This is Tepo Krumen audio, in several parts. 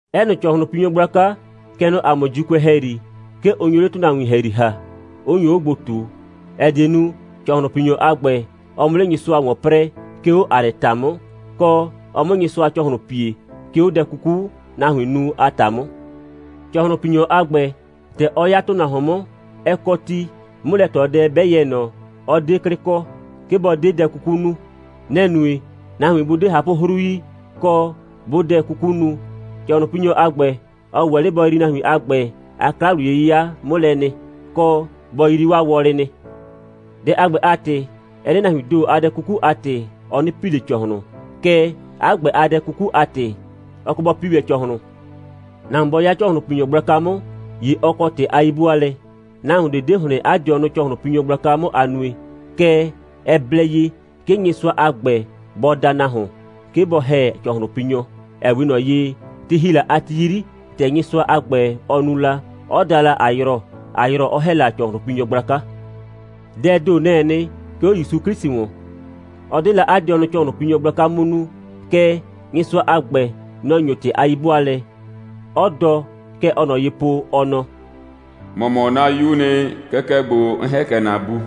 'Ɛ nɩ ‑cɔhlʋnpinyɔ gblaka, kɛ nɔ ‑a mʋ ‑Juukʋɛ ‑hɛyri, 'ke ʋ nyo 'le ‑tʋnahuin ‑hɛyri ‑ha, 'ʋ nyo 'o gbo ꞊tu, ‑ɛ die nu, ‑cɔhlʋnpinyɔ a ‑gbɛ, ɔ 'mʋ 'le Nyɩsʋa ‑wɔn 'prɛɛ, 'ke 'o ‑a nɩ ‑ta 'mʋ, kɔ, ɔ 'mʋ Nyɩsʋa ‑cɔhlʋn pie, 'ke 'o dɛ 'kuku, nahuin nu a ‑ta 'mʋ. ‑Cɔhlʋnpinyɔ a ‑gbɛ, ‑tɛ ɔ 'ya ‑tʋnahuon 'mʋ, ɛ kɔ ti, 'mʋlɛ꞊tɔdɛ 'bɛ yɛ ꞊nɔ, 'ɔ 'de 'klɩ kɔ, 'ke bɔ 'de dɛ 'kuku nu. Nɛ‑ nue, nahuin 'bʋ 'de ꞊hapʋ'hru yi, kɔ, 'bʋʋ dɛ 'kuku nu, ‑cɔhlʋnpinyɔ a ‑gbɛ, 'ɔ ‑wɛ 'le bɔ yrii nahuin a ‑gbɛ a 'kla‑wliye'yɩya 'mʋ lɛ nɩ, kɔ, bɔ yrii 'waa wɔlɩ nɩ. Dɛ a ‑gbɛ a ‑tɩ, ɛ 'de nahuiin ‑do a dɛ 'kuku a ‑tɩ, ɔ 'nɩ pi ꞊le ‑cɔhlʋn. Kɛɛ, 'a ‑gbɛ a dɛ 'kuku a ‑tɩ, ɔ kɔ bɔ pi ‑wɛ ‑cɔhlʋn. Nahuon 'bɔ 'ya ‑cɔhlʋnpinyɔ gblaka 'mʋ, ‑ye ɔ kɔ ‑tɩ a 'yi'bʋaalɛ. Nahuon ꞊de 'de ‑hlɩn 'a dɩɔnʋ ‑cɔhlʋnpinyɔ gblaka 'mʋ a nue. Kɛɛ, ɛ blɛ ye, 'ke Nyɩsʋa a ‑gbɛ bɔ da nahuon, 'ke bɔ ‑hɛ ‑cɔhlʋnpinyɔ, ‑ɛ 'we ꞊nɔ ye, ti ‑hi la a ti 'yri, ‑tɛ Nyɩsʋa a ‑gbɛ, ɔ nu la, 'ɔ da la Ayrɔ, Ayrɔ 'ɔ ‑hɛ la ‑cɔhlʋnpinyɔ gblaka. Dɛɛ ‑do, nɛ‑ɛ nɩ, 'ke 'o ‑Yusu 'Klɩsʋ ‑wɔn. Ɔ 'de la 'a dɩɔnʋ ‑cɔhlʋnpinyɔ gblaka 'mʋ nuu. Kɛɛ, Nyɩsʋa a ‑gbɛ, nɔ‑ ‑nyo ‑tɩ a 'yi'bʋaalɛ, 'ɔ dɔ, kɛ ɔɔ ꞊nɔ ye po, ɔ nɔ: «‑Mɔ mɔ 'na 'Yuu nɩ. Kɛkɛ ‑gbo, 'n ‑hɛ kɛ ‑na Bu.»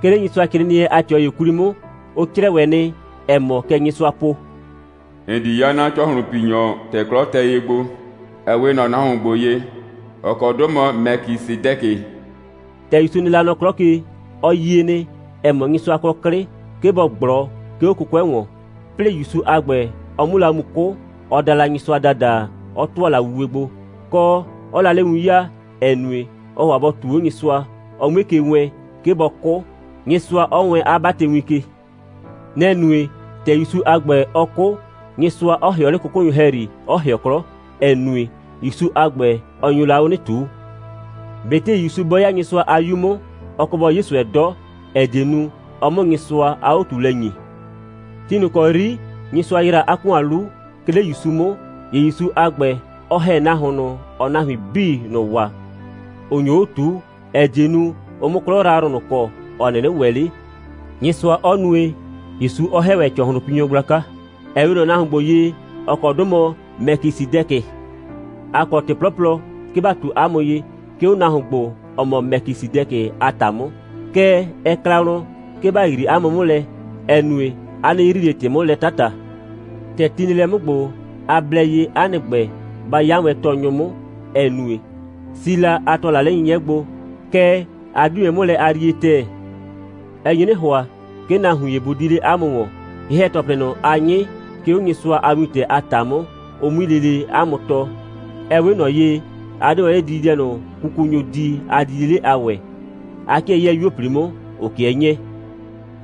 'Ke 'le Nyɩsʋacrɩɩnɩɛ a ꞊tɩɔ ‑ye 'kwli 'mʋ, ʋ 'crɛɛ ‑wɛ nɩ, ‑ɛ mɔ, kɛ Nyɩsʋaa po: «‑N di 'ya ‑cɔhlʋnpinyɔ, ‑tɛ 'klɔ tɛ ye gbo, ‑ɛ 'we ꞊nɔ nahuon ‑gbo ye, ‑ɔ kɔ 'dʋ mɔ Mɛkisɩdɛkɩ.» ‑Tɛ ‑Yusu nɩ la nɔ 'klɔ ke, ɔ yie nɩ, ‑ɛ mɔ, Nyɩsʋa kɔ 'klɩ, 'ke bɔ ꞊gblɔ, 'ke 'o 'kʋkʋɛ ‑wɔn. 'Plɩɩ ‑Yusu a ‑gbɛ, ɔ 'mʋ la mu 'kʋ, ɔ da la Nyɩsʋa ‑dada, 'ɔ ‑tʋa la wuwe gbo, kɔ, 'ɔɔ la 'le win 'yaa, ‑ɛ nue, ɔɔ ‑hʋa bɔ ꞊tuu 'o Nyɩsʋa, ɔ 'mue ke wɛɛn, 'ke bɔ 'kʋ, Nyɩsʋa 'ɔ wɛɛn 'a 'batɩwin ke. Nɛ‑ nue, ‑tɛ ‑Yusu a ‑gbɛ, ɔ 'kʋ, Nyɩsʋa 'ɔ ‑hɩɔ 'le 'kʋkʋnyʋ ‑hɛyri, 'ɔ ‑hɩɔ 'klɔ, ‑ɛ nue, ‑Yusu a ‑gbɛ, ɔ nyo la 'o 'nɩ ꞊tuu. ꞊Betɩ ‑Yusu bɔ 'ya Nyɩsʋa a 'Yu 'mʋ, ɔ kɔ bɔ 'ye ꞊sʋɛ 'dɔ, ‑ɛ die nu, ɔ 'mʋ Nyɩsʋa a 'o꞊tuulɛ 'nyɩ. Ti ꞊nʋ ‑kɔ 'yri Nyɩsʋa ‑yra 'a ‑kʋan 'lu, 'ke 'le ‑Yusu 'mʋ, ‑ye ‑Yusu a ‑gbɛ, ɔ ‑hɛ nahuon ꞊nʋ, ‑ɔɔ nahuin 'bii ꞊nʋ waa, ‑ʋ nyo 'o ꞊tuu, ‑ɛ die nu, ʋ 'mʋ 'klɔ yrayrʋ ꞊nʋ kɔ, ‑ɔ 'nɩnɩ ‑wɛ 'le, Nyɩsʋa 'ɔ nue, ‑Yusu 'ɔ ‑hɛ ‑wɛ ‑cɔhlʋnpinyɔ gblaka, ‑ɛ 'we ꞊nɔ nahuon ‑gbo ye, ‑ɔ kɔ 'dʋ mɔ Mɛkisɩdɛkɩ. ‑A kɔ ‑tɔplɩ 'plɔplɔ, 'ke ‑ba ꞊tu 'a mʋ ye, 'ke 'o nahuon ‑gbo, ‑ɔ mɔ Mɛkisɩdɛkɩ a ‑ta 'mʋ. Kɛɛ, ɛ kla wlɔn, 'ke ‑ba yrii 'a mʋ 'mʋ lɛ, ‑ɛ nue, a 'nɩ yrii ꞊le ‑tɩ 'mʋ lɛ 'tata. ‑Tɛ ti nɩ lɛ 'mʋ ‑gbo, a blɛ ye, 'a nɩ ‑gbɛ, ba 'ya wɛn tɔɔnyʋ 'mʋ, ‑ɛ nue, si la, a ‑tʋa la 'le 'nyɩnyɩɛ gbo, kɛɛ, a 'di wɛn 'mʋ lɛ a yrie ‑tɛɛ. Ɛ nye 'nɩ ‑hʋa, 'ke nahuin ‑ye bʋ di 'le 'a mʋ ‑wɔn, ye‑hɛ‑tɔplɩ ꞊nʋ, a 'nyɩ, 'ke 'o Nyɩsʋa a wintɛ a ‑ta 'mʋ, ʋ 'mui lele 'a mʋ tɔɔ. Ɛ 'we ꞊nɔ ye, a 'de wɛn 'le dididɛ ꞊nʋ, kukunyʋʋ di a didie 'le a ‑wɛɛ. A 'kɩɛ 'yɛɛ 'yuo꞊pli 'mʋ, ‑ʋ 'kɩɛ 'nyɛɛ.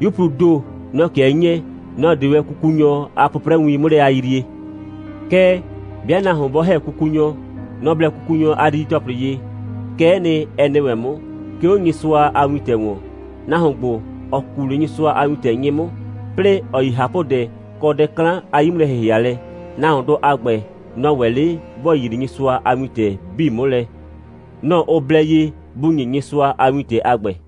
'Yupluu ‑do, nɔ‑ 'kɩɛ 'nyɛɛ, nɔ‑ 'de wɛn kukunyɔ a 'pʋprɛwin 'mʋ lɛ a yrie. Kɛɛ, 'bɩa nahuon 'bɔ ‑hɛ kukunyɔ, nɔ‑ blɛ kukunyɔ a didi‑tɔplɩ ye. Kɛ'ɛ nɩ, ɛ nɩ ‑wɛ 'mʋ, 'ke 'o Nyɩsʋa a wintɛ ‑wɔn. Nahuon ‑gbo, ‑ɔ ku 'le Nyɩsʋa a wintɛ 'nyɩ 'mʋ, 'plɩɩ ‑ɔ yi ꞊hapʋdɛ kɔ dɛ 'klan a 'yi'mʋlɛ‑hɩhɩalɛ, nahuondʋ a ‑gbɛ, nɔ‑ ‑wɛ 'le ‑bɔ yrii Nyɩsʋa a wintɛ 'bii 'mʋ lɛ, nɔ‑ ʋ blɛ ye bʋ ‑nye Nyɩsʋa a wintɛ a ‑gbɛ.